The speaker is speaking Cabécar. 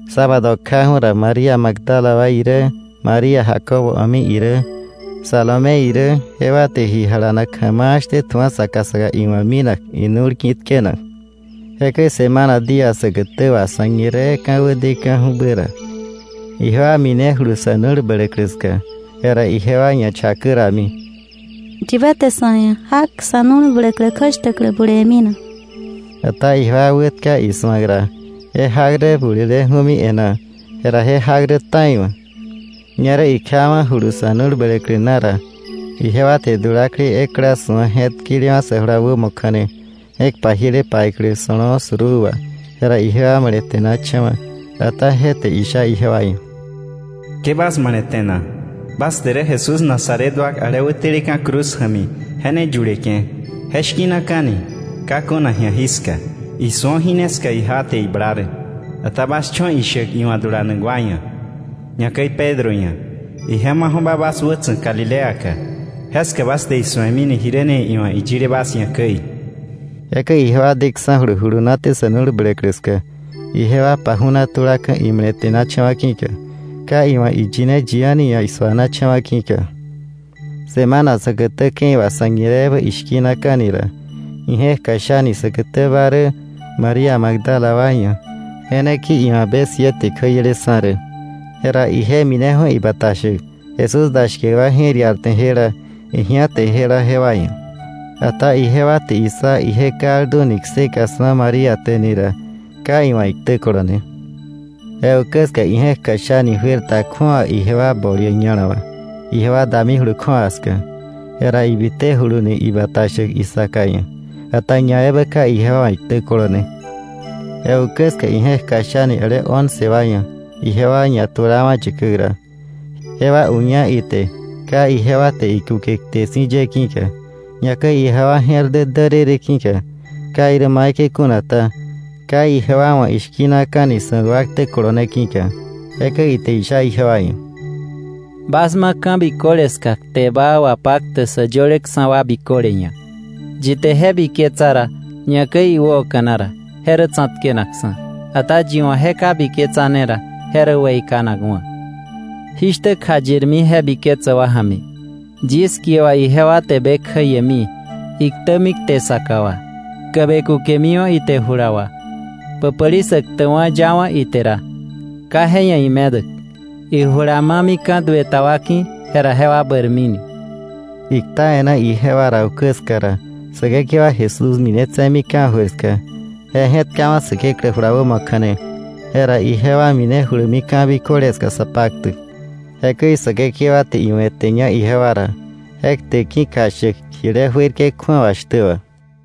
Sábado kjaju̱ ra, María Magdala wa irä, María Jacobo a̱mi irä, Salomé irä, jewa te ji jalanak ja̱ma̱a̱ shtä tju̱a saka saka iwa̱ minak inu̱l ki̱ tkenak. Jekäi semana día säkätä wà sa̱ñiree ka̱wä deka̱ju̱bä ra, ijewa minejulu sa̱ nu̱l bläklä ska. Jera ijewa ñachakä rami: —¿Yibä te sa̱ ia̱ jak sa̱ nu̱l bläklä kjäshtäklä bulewe̱mi na? Ata ijewa wätka isu̱ak ra, je jak rä buleleju̱mi e̱ná; jera je jak rä ta̱iwa̱. Ñerä ikjawa̱julu sa̱ nu̱l bläklä na ra, ijewa te dulaklei ekla su̱a je̱tkelewa̱ sä jula wämo kja̱ne, je̱k pajiele paiklä so̱lo̱o̱ suruu wà. Jera ijewa male̱te̱nacha̱wa̱. Ata je te isha ijewa ia̱: —Ke bas male̱te̱na. Bas te rä Jesús Nazaret wa ale wäteleka̱ cruz ja̱mi je ne yuleke̱. Je shki̱naka̱ni ka kuna ji̱a jiska. ¡Isu̱o! Jí ne ska ijewa te ibla rä. Ata bas cho̱ ishäk iwa̱ dulanak wa ia̱, ñakäi Pedro ia̱: ‘Ije maju̱ba bas wätsa̱k Galileaka; jeska bas te isu̱emini, jiräni iwa̱ iyile bas ia̱ käi.’ Jekäi ijewa deksa̱julu julunaté sa̱ nu̱l bläklä ska, ijewa paju̱na tulaka̱ imale̱te̱nacha̱wa̱ ki̱ka; ka iwa̱ iyine yi a̱ni ia̱ isu̱anacha̱wa̱ ki̱ka. Semana säkätä ke̱i wà sa̱ñireebä ishki̱naka̱ni ra, ije̱k kjashani säkätäba rä María Magdala wa ia̱. Je ne ki̱ka iwa̱ be siete kjäieleksa̱ rä. Jera ije mineju̱ ibata shäk Jesús da shkäk wa je̱r iarte jela, ji̱áte jela jewa ia̱. Ata ijewa te issa ije kalduni kseka su̱a María te ni ra, ka iwa̱ iktä kolone. Je ukä ska ije̱k kjasha̱ni juer ta kju̱awa ijewa bol ia̱ ña̱la wà, ijewa damijulu kju̱awa ska. Jera ibitejuluni ibata shäk isaka ia̱, ata ñaebä ka ijewa wa̱ iktä kolone. Je ukä ska ije̱k kjashani ale once wa ia̱ ijewa ñatulawa̱ yäkäk ra. Jewa uña ite ka ijewa te ikuke kte si̱ ye ki̱ka, ñakäi ijewa je̱r dä därërë ki̱ka. Ka irä maikäi kuna ta, ka ijewa wa̱ ishki̱naka̱ni su̱ak wa ktä kolone ki̱ka. Jekäi ite isha ijewa ia̱: —Bas ma ka̱ biköle ska kte baa wapaktäk sä yöleksa̱ wa biköle ia̱. Yi te je biketsa ra, ñakäi iwäoka̱na ra, je rä tsa̱tkenakksa̱. Ata yi wa̱ je ka biketsane ra, je rä weikanakwa̱. Jí shtä kjayirmi je biketsäk wa ja̱mi: Yis kie wà ijewa te be kjäiemi, iktämi kte saka wà, tkäbe kukemiwa̱ ite jula wà. Päpäli sä ktäkwa̱ yawa̱ ite ra, ka je ia̱ imedäk; ijula mamika̱ duë ta wa ki̱, jera jewa bäirmini. Ikta e̱ná ijewa ra ukä ska ra, Säkekewa Jesús minetse̱mi ka̱jöir ska. Je je̱tkawa̱ Säkeklä jula wämo kja̱ne. Jera ijewa minejulumi ka̱ biköle ska sa paktäk. Jekäi Säkekewa te iwe̱teña ijewa ra je kte ki̱ kjashäk jile juerke̱ kju̱awa shtä wà.